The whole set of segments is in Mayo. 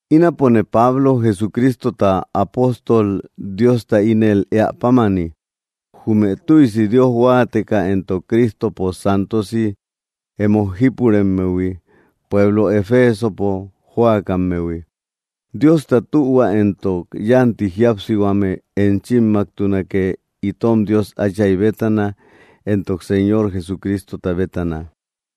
Ínapone Pablo, Jesucristota apóstol Diosta ínel éä pámani, jume tuïsi Dios huáateka entok Cristopo santosi emo jípuremmehui, pueblo Efesopo jóakammehui. Diosta tühua entok yánti jíapsihuame enchimmaktunake, itom Dios Áchay bétana, entok Señor Jesucristota bétana.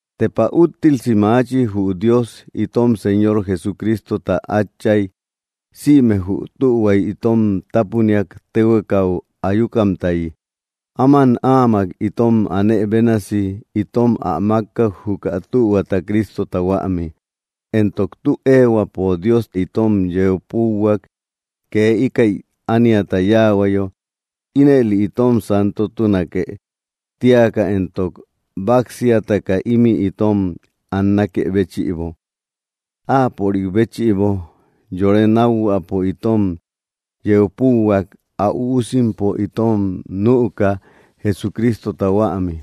¡Tepa úttilsi maachi jü Dios, itom Señor Jesucristota Átchay! Sïme jü tühuay itom tápuniak téhuekau ayukamtayi. Áman áamak itom anë bénasi itom ä mákkak, juka tühuata, Cristota huämi. Entok tü éehuäpo Dios itom yeu púuhuak, kee íkäi ániata yáahuayo, ínëli itom santomtunake tíaka entok báksiataka ímï itom annakë béchïbo, Áapörik béchïbo. Yore nákhuäpo itom yeu púuhuak, ä üusimpo itom nüka, Jesucristota huämi,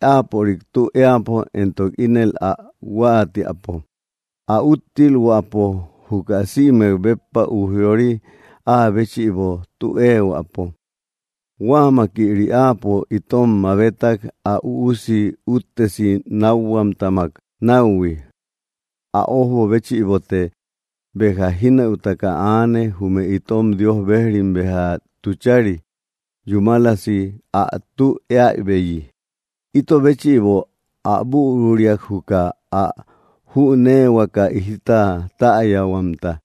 Áapörik tü éäpo entok ínel ä huáatiäpo, ä úttilhuäpo juka sïmek béppa ujyori Áa béchïbo tü éehuäpo. Huámakïri Áapo itom mabetak, ä Üusi úttesi nákhuamtamak náuhui. Ä ójbo béchïbote béja jínëutaka aane, jume itom Dios bejrim béja tuchari, yúmalasi ä tü éäbeyi. Ito béchïbo ä büruriak, juka át jüneehuaka jita täyahuamta.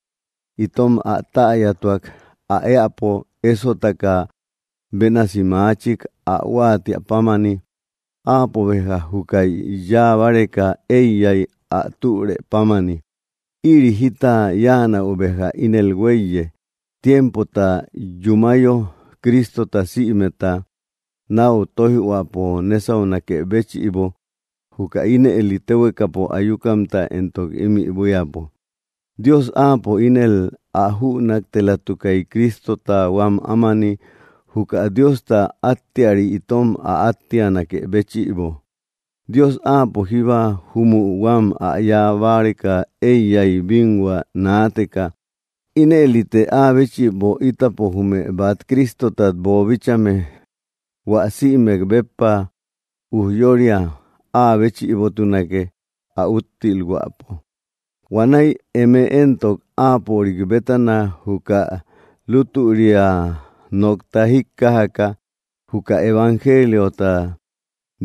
Itom ä täyatuak, ä éäpo ésotaka bénasi maachik, ä huáatiä pámani. Áapo béja júkäi yáa báreka éiyay, ä türë pámani. Ïri jita yáanäu béja ínel huéiye, tiempota yúmayo, Cristota sïmeta náu tóijhuäpo nésaunakë béchïbo, juka ínëli téhuekapo ayukamta entok ímï buíapo. Dios Áapo ínel ä jünaktelatukay, Cristota huam ámani, juka Diosta áttiari itom ä áttianakë béchïbo. Dios Áapo jíba júmü huam ä yáa báreka éiyay, bínhua naateka. Inëlite Áa béchïbo, ítapo jume bát Cristotat boobíchaïhuime, hua sïmek béppa ujyória Áa béchïbotunake, ä úttilhuäpo. Huanäi eme éntok Áapörik bétana juka lutüria nokta jíkkajaka, juka evangeliota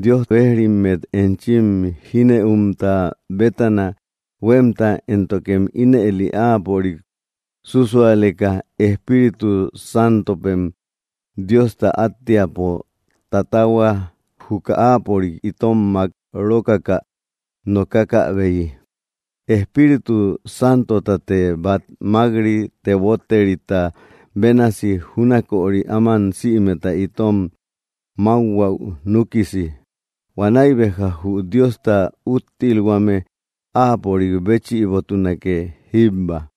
Dios bejrimmet enchim jínëumta bétana huémta, éntokem ínëli Áapörik súsualeka, Espíritu Santopem Diosta áttiapo tatahua juka Áapörik itom mák rókaka nokakäbeyi. Espíritu Santotate bát mák‑ri, teboterita bénasi, júnaköri áman sïmeta itom mákhuäu núkisi. Huanäi béja jü Diosta úttilhuame Áapörik béchïbotunake jíbba.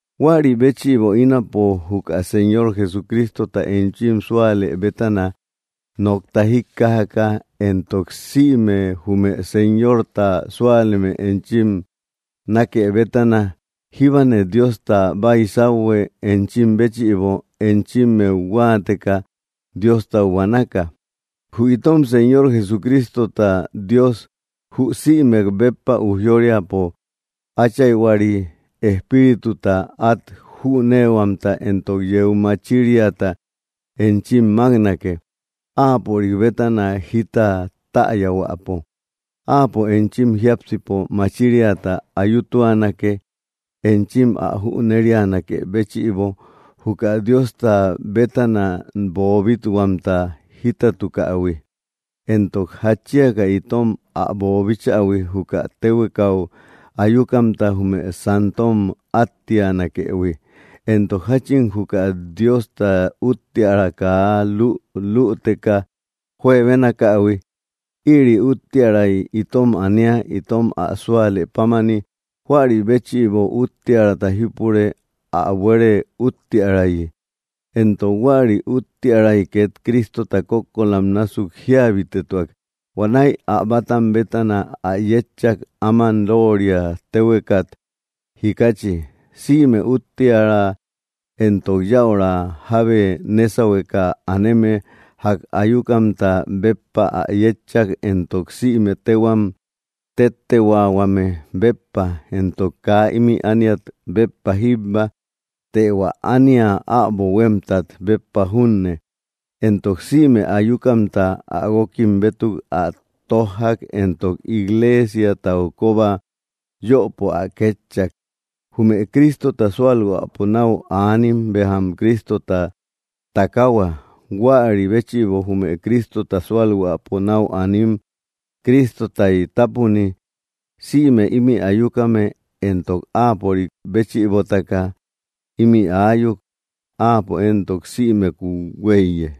Huäri béchïbo ínapo, juka Señor Jesucristota enchim súalë bétana nokta jíkkajaka, entok sïme jume Señorta súaleme enchim nákë bétana, jíbane Diosta baysauhue enchim béchïbo, enchimmeu huáateka Diostau buanaka. Jü itom Señor Jesucristota Dios, jü sïmek béppa ujyóriapo Áchayhuari, espírituta át jüneehuamta entok yeu machiriata enchim máknake, Áapörik bétana jita täyahuäpo. Áapo enchim jiápsipo machiriata ayutuanake, enchim ä jünerianakë béchïbo, juka Diosta bétana boobit-huamta jítatukähui, entok jatchiaka itom ä boobichähui, juka téhuekau ayukamta jume santom áttianakëhui, entok jáchin juka Diosta úttiära kaa lü‑lüteka juebenaakähui. Ïri úttiäray itom ania itom ä súale pámani; huäri béchïbo úttiärata jípure ä buere úttiärayi. Entok huäri úttiäray két Cristota kókkolam násuk jíabitetuak; huanäi ä bátam bétana ä yétchak, áman lóoria téhuekat jikachi. Sïme úttiära entok yäura jábe nésahueka aneme ják ayukamta béppa ä yétchak, entok sïme téhuam téttehuaahuame béppa, entok kaa ímï ániat béppa jíbba, të hua ánia äbo huémtat béppa junne. Entok sïme ayukamta ä guókim bétuk ä tójjak, entok igleesiatau kóba yöpo ä kétchak. Jume Cristota sualhuäpo nau anim béjam Cristota takahua; huäri béchïbo jume Cristota sualhuäpo nau anim Cristotay tápuni. Sïme imï ayukame éntok Áapörik béchïbotaka ímï aayuk; Áapo éntok sïmekuu huéiye.